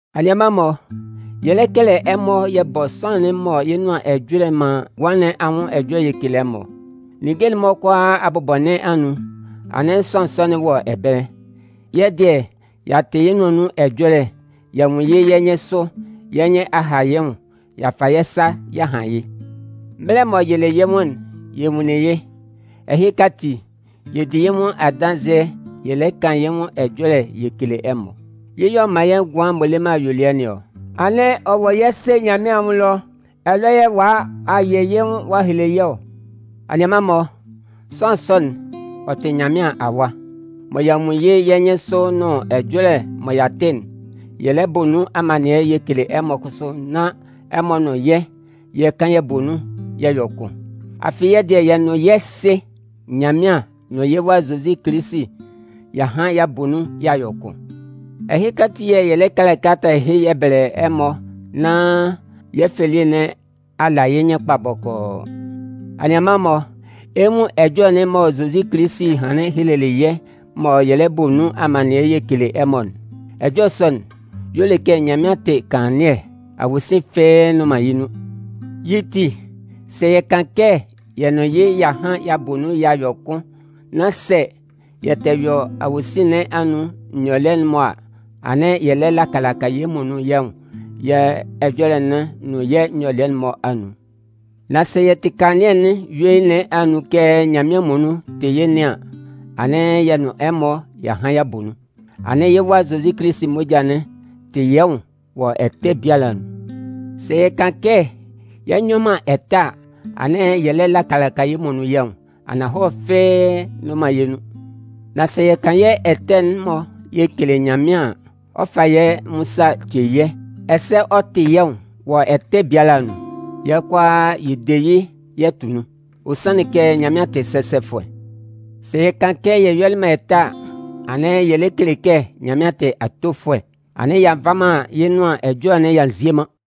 Anianman-mɔ, yɛ lɛ kɛlɛ ɛmɔ yɛ bɔ sʋanlan'n mɔ yɩ́ nʋan ɛjɔlɛ'n man ngʋan nɩn anwʋn ɛjɔlɛ yɛ kele ɛmɔ. Ninnge'n-mɔ kʋalaa abʋbɔ nɩn anun'n, anɩn sʋanlan sɔ'n wɔ ɛbɛlɛ. Yɛ́ dɩɛ, y'a tɩ yɩ́ nʋan anun ɛjɔlɛ, y'a nwun yɩ́ yɛ́ nyɩnsʋ, yɛ́ nyɩn a ha yɩ́ nwʋn y'a fa yɛ́ sa y'a han yɩ́. Mɛlɛ m'ɔ yɩlɩ yɩ́ nwʋn'n, yɛ nwunlin yɩ́. Ɛhɩka ati, yɛ di yɩ́ nwʋn adanzɩɛ yɛ lɛ kan yɩ́ nwʋn ɛjɔlɛ yɛ kele ɛmɔ. Yɩ́ yɛ̂ ɔ man yɛ́ ngʋan m'ɔ le man ayuelɩɛ nɩn ɔ. Anɩn ɔ wɔ yɛ́ Sɩ Nyanmɩan anwʋn ɛlɔ yɛ̂ ɔ'a a yɩ yɩ́ nwʋn ɔ'a hele yɛ́ ɔ. Anianman-mɔ, sʋanlan sɔ'n, ɔ tɩ Nyanmɩan Awa. Mɔ y'a nwun yɩ́ yɛ́ nyɩnsʋ nʋn ɛjɔlɛ mɔ y'a tɩ'n, yɛ lɛ bɔ nun amannɩɛ yɛ kele ɛmɔ kʋsʋ nán ɛmɔ nʋn yɛ́, yɛ kan yɛ bɔ nun yɛ yɔ kʋn. Afɩ yɛ́ dɩɛ, yɛ nʋn yɛ́ Sɩ Nyanmɩan nʋn yɩ́ Wa Zozi Kilisi y'a han y'a bɔ nun y'a yɔ kʋn. Ɛhɩka ati yɛ̂ yɛ lɛ kɛlɛ kalata ɛhɩ yɛ bɛlɛ ɛmɔ nán yɛ́ fɛ elie nɩn a la yɩ́ nyɩn kpa bɔkɔɔ. Anianman-mɔ, ɛ 'nwun ɛjɔlɛ'n mɔ Zozi Kilisi hanlɩn helelɩ yɛ́ mɔ yɛ lɛ bɔ nun amannɩɛ yɛ kele ɛmɔ'n. Ɛjɔlɛ sɔ'n, y'ɔ le kɛ Nyanmɩan tɩ kanlannɩɛ, awosin fɩ́ɩ́ nnʋn man yɩ́ nun. Yɩ́ ti, sɛ yɛ kan kɛ yɛ nʋn yɩ́ y'a han y'a bɔ nun y'a yɔ kʋn nán sɛ yɛ tɛ yɔ awosin nɩn anun nyɔlɩɛ'n-mɔ a, anɩn yɛ lɛ laka laka yɛ́ muonun yɛ́ nwʋn yɛ́ ɛjɔlɛ'n nʋn yɛ́ nyɔlɩɛ'n-mɔ anun. Nan sɛ yɛ tɩ kanlannɩɛ'n yuein nɩn anun kɛ Nyanmɩan muonun tɩ yɩ́ nɩn an, anɩn yɛ nʋn ɛmɔ, y'a han y'a bɔ nun. Anɩn yɩ́ Wa Zozi moja'n tɩ yɛ́ nwʋn wɔ ɛtɛ biala anun. Sɛ yɛ kan kɛ yɛ nyɔ man ɛtɛ a, anɩn yɛ lɛ laka laka yɛ́ muonun yɛ́ nwʋn, ananhɔlɛ fɩ́ɩ́ nnʋn man yɛ́ nun. Nan sɛ yɛ kan yɛ́ ɛtɛ'n-mɔ yɛ kele Nyanmɩan an, ɔ 'fa yɛ́ nwʋn sa ɔ ce yɛ́, ɛsɛ ɔ 'tɩ yɛ́ nwʋn wɔ ɛtɛ biala anun. Yɛ kʋala yɛ de yɩ́ yɛ tʋ nun. Ɔ sanlɩn kɛ Nyanmɩan tɩ sɛsɛfʋɛ. Sɛ yɛ kan kɛ yɛ yɔlɩ man ɛtɛ a, anɩn yɛ lɛ kele kɛ Nyanmɩan tɩ atofʋɛ. Anɩn y'a nva man yɩ́ Nʋan Ɛjɔlɛ'n y'a nzie man.